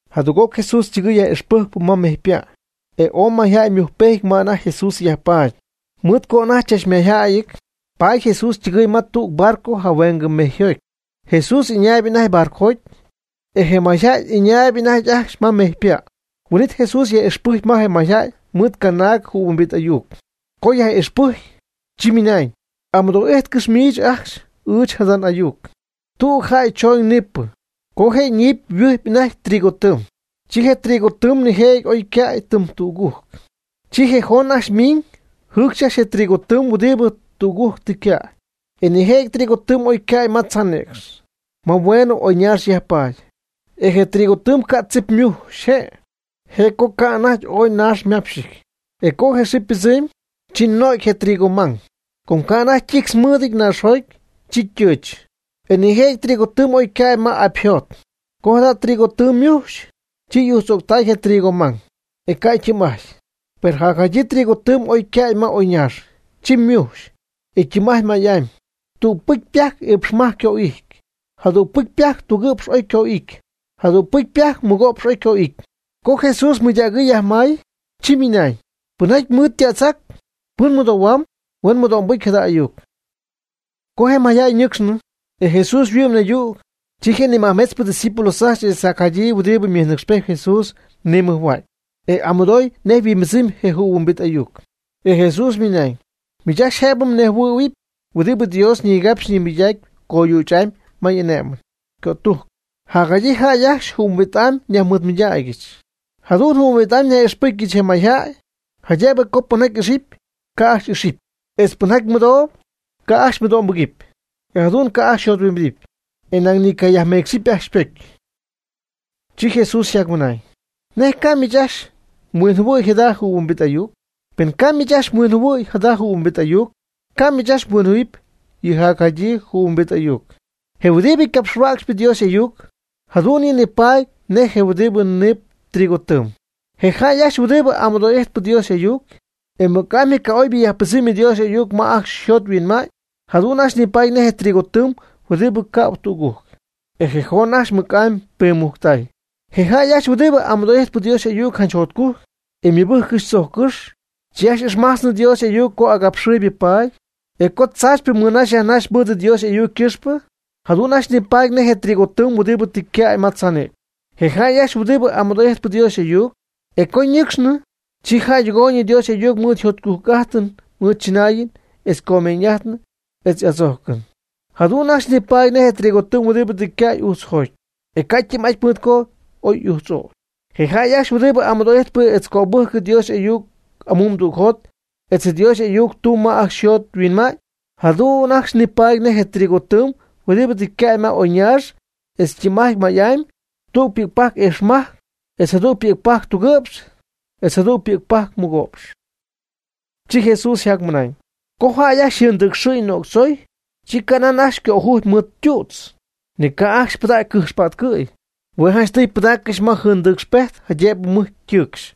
Jadüg'oc Jesús ytɨgɨɨy yaj'ixpɨjcpɨ ma mejypa'. E ooy mayjäy ymujcpejty ma anajty Jesús yajpaady. Mɨɨd co ooy anajty chachmayjäyɨty, paady Jesús ytɨgɨy ma tüg barco jahuengɨ mejyjoty. Jesús ɨñaayb anajty barcojoty, e je mayjäy ɨñaayb anajty ajcxy ma mejypa'. Huin'it Jesús yaj'ixpɨjcy je mayjäy mɨɨd canaag jɨhuimbit ayuc. Co yaj'ixpɨcy, chi ymɨnañ: ―Amɨdoo'ijtcɨx miich ajcxy ɨɨch jada n'ayuc. Tüg jäy chooñ niipɨ. Co je niipɨ yhuɨjpy anajty trigo tɨɨm, chi je trigo tɨɨm nijëjɨty oy ycäy tɨm tügujc. Chi je joon ajcxy ymiiñ jɨcxy je trigo tɨɨm huɨdibɨ tügujc tɨ ycäy. E nijëjɨty trigo tɨɨm oycäy ma tzaanïcx, ma nihueeñ oyñaax yajpaady. E je trigo tɨɨm ca' tzip mujx je', je'co ca'anajty ooy naax mápxɨty. E co je xɨɨ ypɨdzɨmy, chi no'cy je trigo mang, com ca' anajty ytictz mɨɨdɨty naaxjoty, chi ytɨɨch. E nijëjɨty trigo tɨɨm oycäy ma apyjot. Co jada trigo tɨɨm ymujxy, chi y'ujtz'ögtäy je trigo mang, e ca' ytɨɨm'ajty. Per jacjadyii trigo tɨɨm oycäy ma oyñaax, chi ymujxy, e ytɨɨm'ajt may'amy: tüg pi'c pajc iipxmajc oyco'ity, jadüg pi'c pajc tugɨ'px oyco'ity, jadüg pi'c pajc mɨgo'px oyco'ity. Co Jesús je mɨydägɨɨ yajmay, chi ymɨnañ: ―Pɨnjaty mɨɨd ytätzac, pɨn mɨdohuamy, huen mɨdo'mbɨcy jada ayuc. Co je mayjäy ñɨcxnɨ, e Jesús yhuɨ'my naydüg, chi je nimajmetzpɨ ydiscípulos ajcxy etz jacjadyii huɨdib mɨjnɨcxpejt Jesús ñimɨjhua'cy, e amɨdoy nej yhuimbɨdzɨmy je jɨhuimbit ayuc. E Jesús ymɨnañ: ―Miich ajcxy jaydëb mnejhuɨ̈huɨpy huɨdibɨ Dios ñigapxpy ñimɨydacpy coyüch'amy ma y'ané'mɨn ycötújcɨn. Jacjadyii jäy ajcxy jɨhuimbit'amy nyajmɨɨdmɨydaacyɨch. Jadu'n jɨhuimbit'amy nyaj'ixpɨjcpyɨch je mayjäy, jaydëb co pɨnjaty ijxp, ca' ajcxy ixɨpy; etz pɨnjaty mɨdoob, ca' ajcxy mɨdo'mbɨgɨpy. E jadu'n ca' ajcxy yjothuimbidip, e nañ ni ycayajmeecxɨpy ajcxy ypocy. Chi Jesús yjacmɨnañ: ―¿Nej ca' miich ajcxy mhuinjɨhuɨ̈y jada jɨhuimbit ayuc? Pen ca' miich ajcxy mhuinjɨhuɨ̈y jada jɨhuimbit ayuc, ca' miich ajcxy mhuinjɨhuɨ̈huɨp yɨ jacjadyii jɨhuimbit ayuc. Je huɨdibɨ capxhuäcxp Dios y'ayuc, jadu'n yɨ' nipaady nej je huɨdibɨ niip trigo tɨɨm. Je jäy ajcxy huɨdibɨ amɨdoo'ijtp Dios y'ayuc, e mɨc'amy je ca'oybɨ yajpɨdzɨmy Dios y'ayuc ma ajcxy yjot yhuinma'ñ, jadu'n ajcxy nipaady nej trigo tɨɨm huɨdibɨ cäb tügujc, e je joon ajcxy mɨc'amy piimujctay. Je jäy ajcxy huɨdibɨ amɨdoo'ijtp Dios y'ayuc janch jotcujc, e mɨbɨ́jccɨxy tzojccɨ́x, chi ajcxy ixmajtzɨ Dios y'ayuc co agapxɨɨyb paady, e co tzaachypɨ mɨnaxy yajnaxy mɨɨd Dios y'ayuc ycɨxpɨ. Jadu'n ajcxy nipaady nej je trigo tɨɨm huɨdibɨ tɨ ycäy ma tzaanïcx. Je jäy ajcxy huɨdibɨ amɨdoo'ijtp Dios y'ayuc, e co ñɨcxnɨ, chi jäydɨgooyñɨ Dios y'ayuc mɨɨd jotcujc'ájtɨn tzɨnaayɨn, etz comeeñ'ájtɨn etz adzójcɨn. Jadu'n ajcxy nipaady nej trigo tɨɨm huɨdibɨ tɨ ycäy ujtzjoty, e ca' ytɨɨm'aty mɨɨd co oy y'ujtz'ögy. Je jäy ajcxy huɨdibɨ amɨdoo'ijtp etz cöbɨjcp Dios y'ayuc amumdügjot etz Dios y'ayuc tumb ma ajcxy yjot yhuinma'ñ, jadu'n ajcxy nipaady nej je trigo tɨɨm huɨdibɨ tɨ cäb ma oyñaax etz ytɨɨm'aty may'amy: tüg pi'cpajc iipxmajc, etz jadüg pi'cpajc tugɨ'px, etz jadüg pi'cpajc mɨgo'px. Chi Jesús yjacmɨnañ: ―Co jäy ajcxy jɨndɨcxɨ'ñ nöctzoy, chi canan ajcxy cöjujpy mɨɨd tu'tz, ni ca' ajcxy pɨdacy cɨjxpa'tcɨ'py, hue' janchtɨy pɨdaaccɨxy ma jɨndɨcxpejt jaydëb mɨj ytɨɨcxy.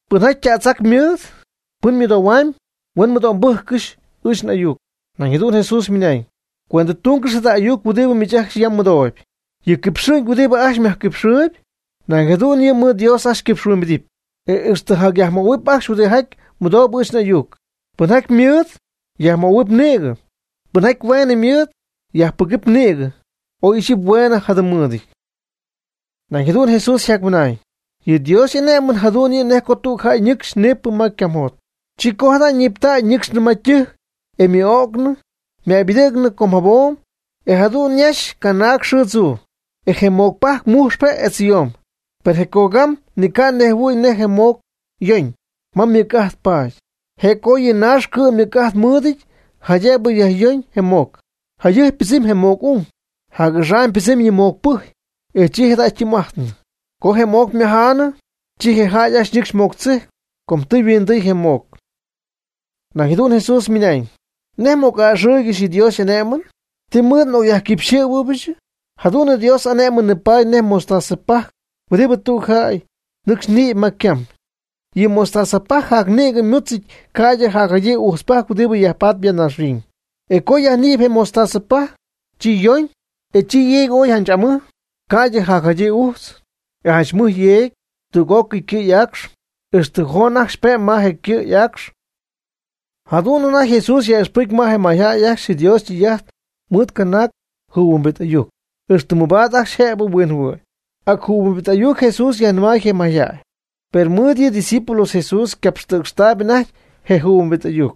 Pɨnjaty ytätzac ymɨɨd, pɨn mɨdoohuamb, huen mɨdo'mbɨ́jccɨxy ɨɨch n'ayuc. Nañ jadu'n Jesús ymɨnañ: ―Cuendtúngɨx jada ayuc huɨdibɨ miich ajcxy yam mmɨdooyb. Yɨ quipxɨ'ñ huɨdibɨ ajcxy myajquipxɨɨyb, nañ jadu'n yɨ' mɨɨd Dios ajcxy xyquipxyhuimbidɨpy, e ixtɨ jacyajmöhuɨp ajcxy huɨdijaty mɨdoob ɨɨch n'ayuc. Pɨnjaty ymɨɨd, yajmöhuɨp nïgɨ, pɨnjaty hueen mɨɨd, yajpɨgɨpy nïgɨ (oy ixyipy hueen jadɨm mɨɨdɨty). Nañ jadu'n Jesús ymɨnañ: ―Yɨ Dios y'ané'mɨn jadu'n yɨ' nej co tüg jäy nɨcxy ñïpy ma ycamjot. Chi jada' co ñiiptay ñɨcxnɨ ma ytɨjc e ymɨ'o'cnɨ ymäybɨdɨ̈gnɨ com jabom, e jadu'n yajnaxy canaag xɨɨ tzuu. E je moc pajc mujxp je' etz yomb. Per je cogam ni ca' nejhuɨ̈y nej je moc yoñ, ma mɨc'ajt paady. Je' co yɨ naax cɨ'm mɨc'ajt mɨɨdɨty jaydëb yajyoñ je moc. Jayɨjp ypɨdzɨmy je moc ung, jac'axam ypɨdzɨmy yɨ moc pɨjy, e chi jada' ytɨɨm'ajtnɨ. Co je moc ymajaanɨ, chi je jäy ajcxy nɨcxy moc tzijcp, com tɨ yhuindɨy je moc. Nañ jadu'n Jesús ymɨnañ: ―¿Nej m'oc'a'ɨxɨ́ɨygɨxy yɨ Dios y'ané'mɨn? ¿Ti mɨɨd n'ocyajquipyxɨ̈huɨbɨch? Jadu'n Dios y'ané'mɨn nipaady nej mostaza pajc huɨdibɨ tüg jäy nɨcxy niipy ma ycam. Yɨ mostaza pajc jacnïgɨ ymútzɨty ca'ydɨ jacjadyii ujtzpajc huɨdibɨ yajpatp ya naaxhuiñ. E co yajnïpy je mostaza pajc, chi yoñ, e chi yeegy ooy janch mɨj, ca'ydɨ jacjadyii ujtz. E janch mɨj yeegy tüg'ócɨy ycɨ' y'aacx, ixtɨ joon ajcxy pe'mb ma je ycɨ'y'aacx y'anicɨ̈y. Jadu'n anajty Jesús yaj'ixpɨcy je mayjäy ajcxy Dios ytɨy'ajt mɨɨd canaag jɨhuimbit ayuc, ixtɨ mɨbaad ajcxy jëb huinjɨhuɨ̈y. Ac jɨhuimbit ayuc Jesús yajnɨmay je mayjäy. Per mɨɨd yɨ'ydiscípulos Jesús ycapxtɨ̈cxtaayb anajty je jɨhuimbit ayuc.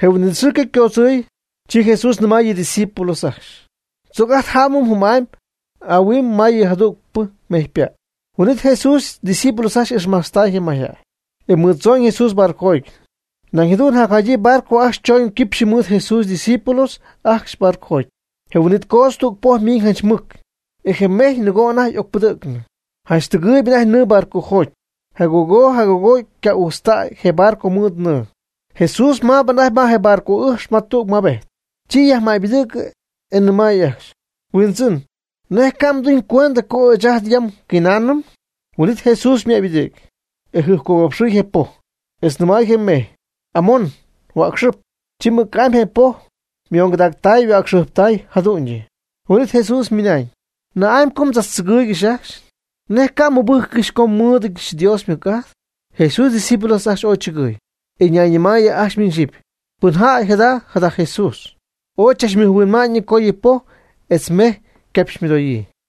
Je huin'it xɨɨ co ycoodzɨɨy, chi Jesús nɨmay yɨ ydiscípulos ajcxy: ―Tzoc ajt jámɨm jɨm'amy ahuin ma yɨ jadügpɨ mejypa'. Huin'it Jesús ydiscípulos ajcxy ixmajtztay je mayjäy, e mɨɨd tzooñ Jesús barcojoty. Nañ jadu'n jacjadyii barco ajcxy choñ quipxy mɨɨd Jesús ydiscípulos ajcxy ybarco. Je huin'it coodz tüg poj miiñ janch mɨc. E je mejy nɨgoo anajty y'ocpɨdɨ̈gnɨ. Janch tɨgɨɨyb anajty nɨɨ barcojoty, jagoo jagoo yca'ujtztay je barco mɨɨd nɨɨ. Jesús maab anajty ma je barco ɨjx ma tüg mabejt. Chi yajmäybɨdɨ̈gɨ, e nɨmay ajcxy: ―Huindzɨn, ¿nej ca'mduñcuend co ɨɨch ajt yam nguinaanɨm? Huin'it Jesús ymäybɨdɨ̈gy, e jɨjpcogapxɨy je poj. Etz nɨmay je mejy: ―¡Amon! ¡Huäcxɨp! Chi mɨc'amy je poj ymongɨdactay yhuäcxɨjptay jadu'ñyɨ. Huin'it Jesús ymɨnañ: ―¿Na'amy co mdzachtzɨgɨɨygɨxy ajcxy? ¿Nej ca' mmɨbɨ́jccɨxy co nmɨɨdɨch Dios ymɨc'ajt? Jesús ydiscípulos ajcxy ooy chɨgɨɨy, e ñayñɨmaayɨ ajcxy miñ xyɨpy: ―¿Pɨn jäy jada' jada Jesús? Ooy chachmɨjhuinma'ñ co yɨ poj etz je mejy ycapxymɨdoyii.